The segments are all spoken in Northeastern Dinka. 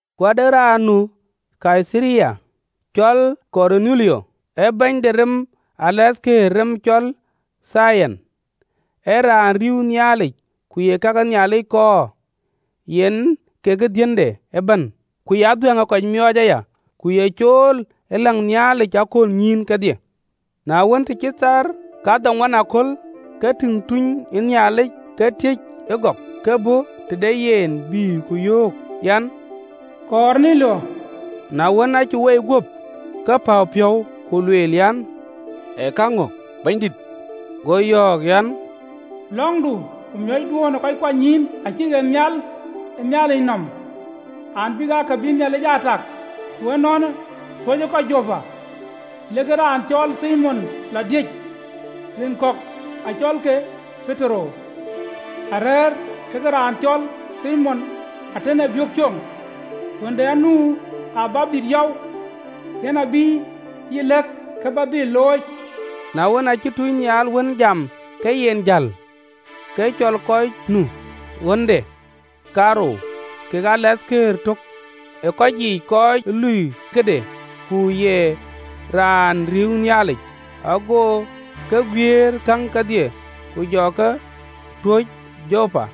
Ku ade raan nu Kaitharia, cɔl Korunelio, ee bɛ̈ny de rem de Romai, “Rem cɔl Tiliyan.” Ee raan rïïu Nhialic, ku ye ka ke Nhialic kɔɔr, yen kekë dhiënde ëbɛ̈n, ku ye adhuɛ̈ŋ ee kɔc miɔɔc aya, ku ye cool ë läŋ Nhialic ë aköölnyïïn kedhie. Na wën, të cït thaar kadhoŋuan aköl, ke tïŋ tunynhial ë Nhialic ke tiëc ëgɔk, ke bɔ̈ tëde yen, bï ku yöök an, “Korunelio!” Na wën, aacï woi guöp, ke päu piɔ̈u, ku lueel an, “Ee käŋö Bɛ̈nydït?” Go ë tunynhial yɔ̈ɔ̈k an, “Lɔ̈ŋdu ku miɔ̈cduön ë kɔc kuanynyïïn acïk ɣet nhial ë Nhialic nɔm an, bïk aa ka bï Nhialic aa tak. Ku ënɔɔnë, tuöcë kɔc Jopa, lek raan cɔl Thimon lɔ diëc, rin kɔ̈k acɔlke Petero. Arɛ̈ɛ̈r kekë raan cɔl Thimon atën ee biök coŋ, ɣönde anu ë wɛ̈ɛ̈r yɔu, yen abï yï lɛ̈k kë bä dhil looi.” Na wën, aacï tunynhial wën jam ke yen jäl, ke cɔl kɔc lui ɣönde kaarou, kekë raan töŋ ë rem de tɔŋ, raan ee cool ë loi këde, ku ye raan riëëu Nhialic. Ago ke guiëër käŋ kedhie, ku jɔ ke tuɔɔc Jopa.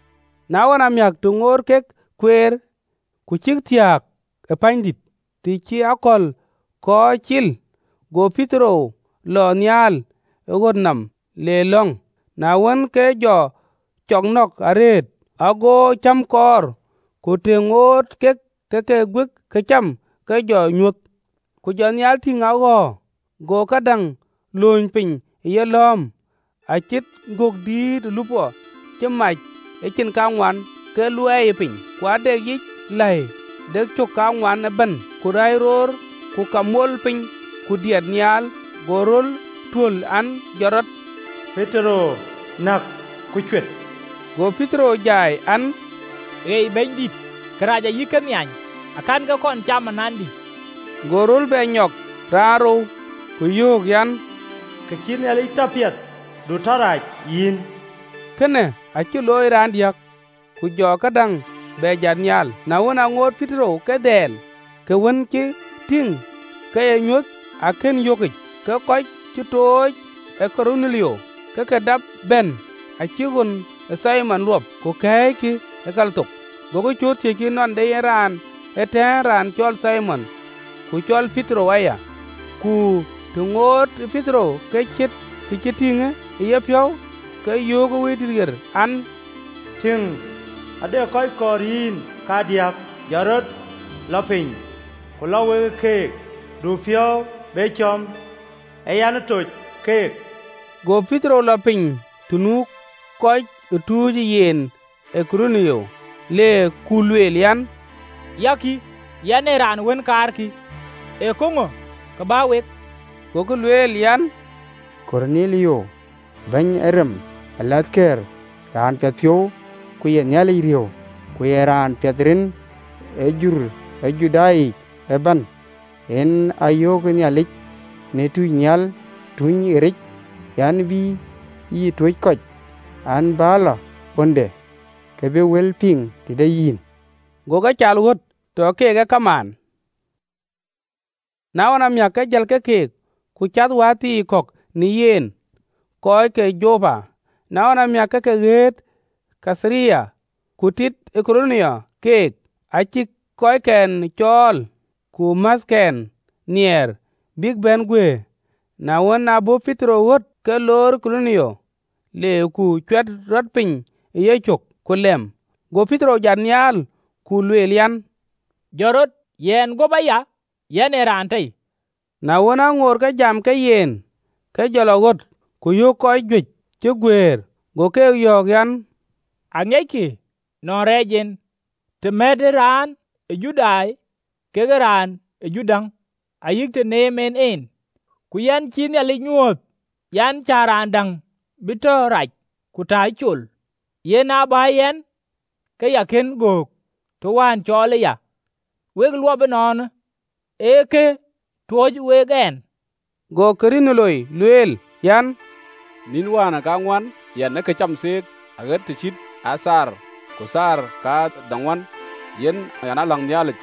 Na ɣɔn amiäk, të ŋoot kek kueer, ku cïk thiääk ë pänydït, të cï akɔ̈l kɔ̈ɔ̈c cil, go Petero lɔ nhial ë ɣöt nɔm le lɔ̈ŋ. Na wën, ke jɔ cɔk nɔ̈k arëët, ago cäm kɔɔr, ku të ŋoot kek ë ke guik këcam, ke jɔ nyuöth. Ku jɔ nhial tïŋ a ɣɔ̈ɔ̈r, go këdäŋ lööny piny ë yelɔ̈ɔ̈m, acït gök dïït ë lupɔ, cï mac ë cin kaŋuan, ke luɛɛiyë piny. Ku ade yic läi de cök kaŋuan ëbɛ̈n ku läi roor ku kak ee mol piny ku diɛt nhial. Go röl tuöl an, “Jɔt rɔt, Petero, näk, ku cuet!” Go Petero jai an, “Ei, Bɛ̈nydït, kërac ayï kënhiany akɛ̈n ke kɔn cam anandï!” Go röl bɛ nyɔk raanrou, ku yöök an, “Kë cïï Nhialic tɔ piɛth, du tɔ rac, yïn.” Kënë acï looi raandiäk: ku jɔ këdäŋ bɛ jat nhial. Na wën, aŋoot Petero ke dhɛl kë wën cï tïŋ ke ee nyuöth, akën yökic, ke kɔc cï tooc ë Korunelio ke ke dap bɛ̈n, acïk ɣön ë Thimon luɔp, ku kɛ̈ɛ̈ckï ë kal thok. Gokï cööt, thiëckï nɔn de raan ëtɛ̈ɛ̈n, raan cɔl Thimon, ku cɔl Petero aya. Ku të ŋoot Petero kë ciët kë cï tïŋ e yepiɔ̈u, ke yöök ë Wëidït an, “Tïŋ, ade kɔc kɔɔr yïn kadiäk. Jɔt rɔt, lɔ piny ku lɔ we keek, du piɔ̈u be cɔ̈m, ee yɛn ë toc keek.” Go Petero lɔ piny të nu kɔc ë tucë yen ë Korunelio, le ku lueel an, “Ya kï, yɛn ee raan wën, kaarkï: ee käŋö kë bä wek?” Gokï lueel an, “Korunelio, bɛ̈ny ë rem de tɔŋ, raan piɛthpiɔ̈u, ku ye Nhialic riëëu, ku ye raan piɛth rin ë jur ë Judai yic ëbɛ̈n. Go tunynhial ɣeric a yöök an, bï yï tuöc kɔc an, bä lɔ ɣönde, ke bï wël piŋ tëde yïn.” Go ke caal ɣöt, tɔ keek ee kamaan. Na ɣɔn amiäk, ke jël ke keek, ku cath wäthii kɔ̈k në yen, kɔc ke Jopa. Na ɣɔn amiäk, ke ke ɣet Kaitharia. Ku tit Korunelio keek, acï kɔcken cɔɔl ku määthkɛn nhiɛɛr, bïk bɛ̈n guëër. Na wën, aa bɔ̈ Petero ɣöt, ke loor Korunelio, le ku cuɛt rɔt piny ë yecök, ku lɛm. Go Petero jat nhial, ku lueel an, “Jɔt rɔt, yɛn guöp aya yɛn ee raan tei.” Na wën, aŋoot ke jam ke yen, ke jɔ lɔ ɣöt, ku yök kɔc juëc cï guëër. Go keek yɔ̈ɔ̈k an, “Aŋiɛckï nɔn rɛɛc en, të mɛ̈të raan ë Judai kekë raan ë jur däŋ, ayï të neem en en, ku yɛn cïï Nhialic nyuööth an, cä raan däŋ bï tɔ rac ku ta nhiany. Yen aa bä yɛn, ke ya kën göök, të wään cɔɔlë ya. Wek luɔp ënɔɔnë, ë kë ë tuöc wek ɛn?” Go Korunelio lueel, an, “Nïn wäänë kaŋuan, yɛn ë këcam theek aɣet të cït ee kaamë, ku thaar kadhoŋuan yɛn aa läŋ Nhialic,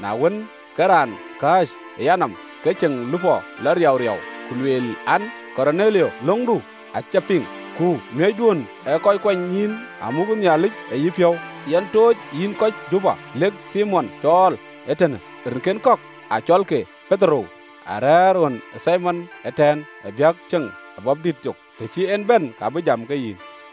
na wën, ke raan kääc ë yanɔm ke ceŋ lupɔ lɔ riauriau, ku lueel, an, ‘Korunelio, lɔ̈ŋdu acï piŋ, ku miɔ̈cduön ë kɔc kuanynyïïn amuk ë Nhialic ë yepiɔ̈u. Yen tooc yïn kɔc Jopa, lek Thimon cɔɔl ee tënë, rinkɛn kɔ̈k acɔlke Petero, arɛ̈ɛ̈r ɣön e Thimon atën ee biök coŋ në wɛ̈ɛ̈r yɔu, të cï en bɛ̈n, ka bï jam ke yïn.’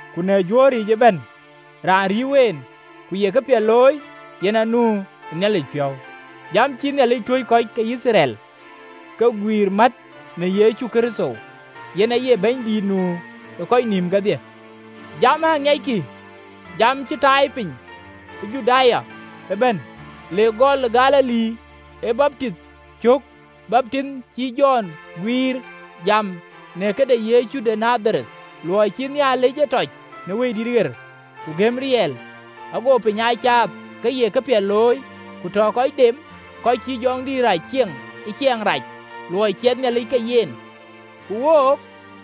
Ku në juöör yiic ëbɛ̈n, raan riëëu en ku ye këpiɛth looi, yen anu ë Nhialic piɔ̈u. Jam cïï Nhialic tuöc kɔc ke Yithriɛl, ke guiir mät në Yecu Kërtho, yen aye Bɛ̈nydït nu ë kɔc nïïm kedhie. Jamë aŋiɛckï, jam cï tai piny ë Juda ëbɛ̈n, le gɔl Galili, ë baptith cök baptith cïï Jɔn guiir. Jam në këde Yecu de Nadhareth, luɔi cï Nhialic e tɔc në Wëidït ɣer, ku gɛ̈m riɛl. Ago piny aa caath ke ye këpiɛth looi, ku tɔ kɔc dem kɔc cïï jɔŋdït rac cieŋ ë ciɛɛŋ rac, luɔi ciɛthë Nhialic ke yen. Ku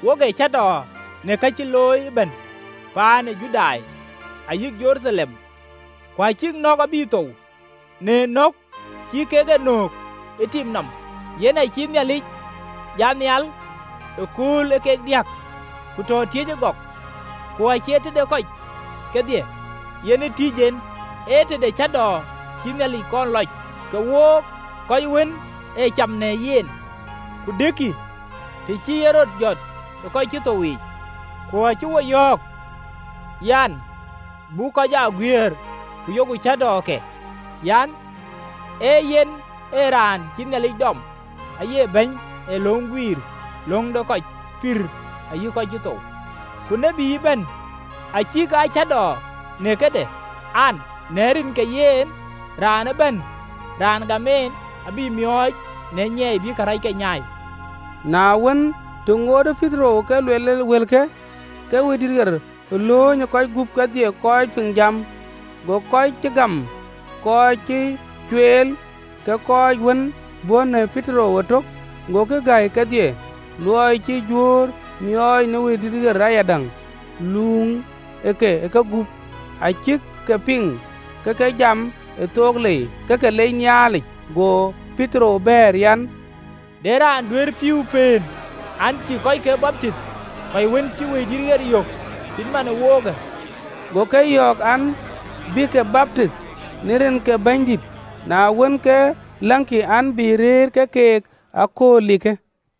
wook ee cäätɔɔ në ka cï looi ëbɛ̈n paan ë Judai, ayï Jeruthalem, ku acïk nɔ̈k abï thou, në nök cï kek e nöök në tim nɔm. Ku yen acïï Nhialic jat nhial ëkööl ee kek diäk, ku tɔ tiëc ëgɔk, ku acie tëde kɔc kedhie, yen ë tïc en, ee tëde cäätɔɔ cïï Nhialic kɔn lɔc, kek wook, kɔc wën ee cam në yen ku dëkkï, të cï en rɔt jɔt ë kɔc cï thou yiic. Ku acï wo yɔ̈ɔ̈k an, buk kɔc aa guiëër ku yok cäätɔɔke an, ee yen ee raan cïï Nhialic dɔm aye Bɛ̈ny ee löŋ guiir löŋ de kɔc pïïr ayï kɔc cï thou. Ku tït ëbɛ̈n acïk aa cäätɔɔ në këde an, në rin ke yen raan ëbɛ̈n raan gam en abï miɔɔc në nyiɛɛi bï karɛcke nyaai. Na wën, të ŋootë Petero ke luel wëlke, ke Wëidït ɣer lööny ë kɔc gup kedhie kɔc piŋ jam. Go kɔc cï gam kɔc cï cueel, ke kɔc wën bɔ̈ në Petero ëtök, agokï gäi kedhie, luɔi cï Juöör miɔɔc në Wëidït ɣer ayadäŋ, luuŋëke ë kegup. Acïk ke piŋ ke ke jam ë thook lei, ke ke lec Nhialic. Go Petero bɛ̈ɛ̈r, an: “De raan duëër pïïu pëën an, cïï kɔckë baptith, kɔc wën cï Wëidït ɣer yök cït man ë wokë?” Go ke yɔ̈ɔ̈k an, bïke baptith në rin ke Yecu Kërtho. Na wën, ke läŋkï, an, bï rëër ke keek ë akööl likë.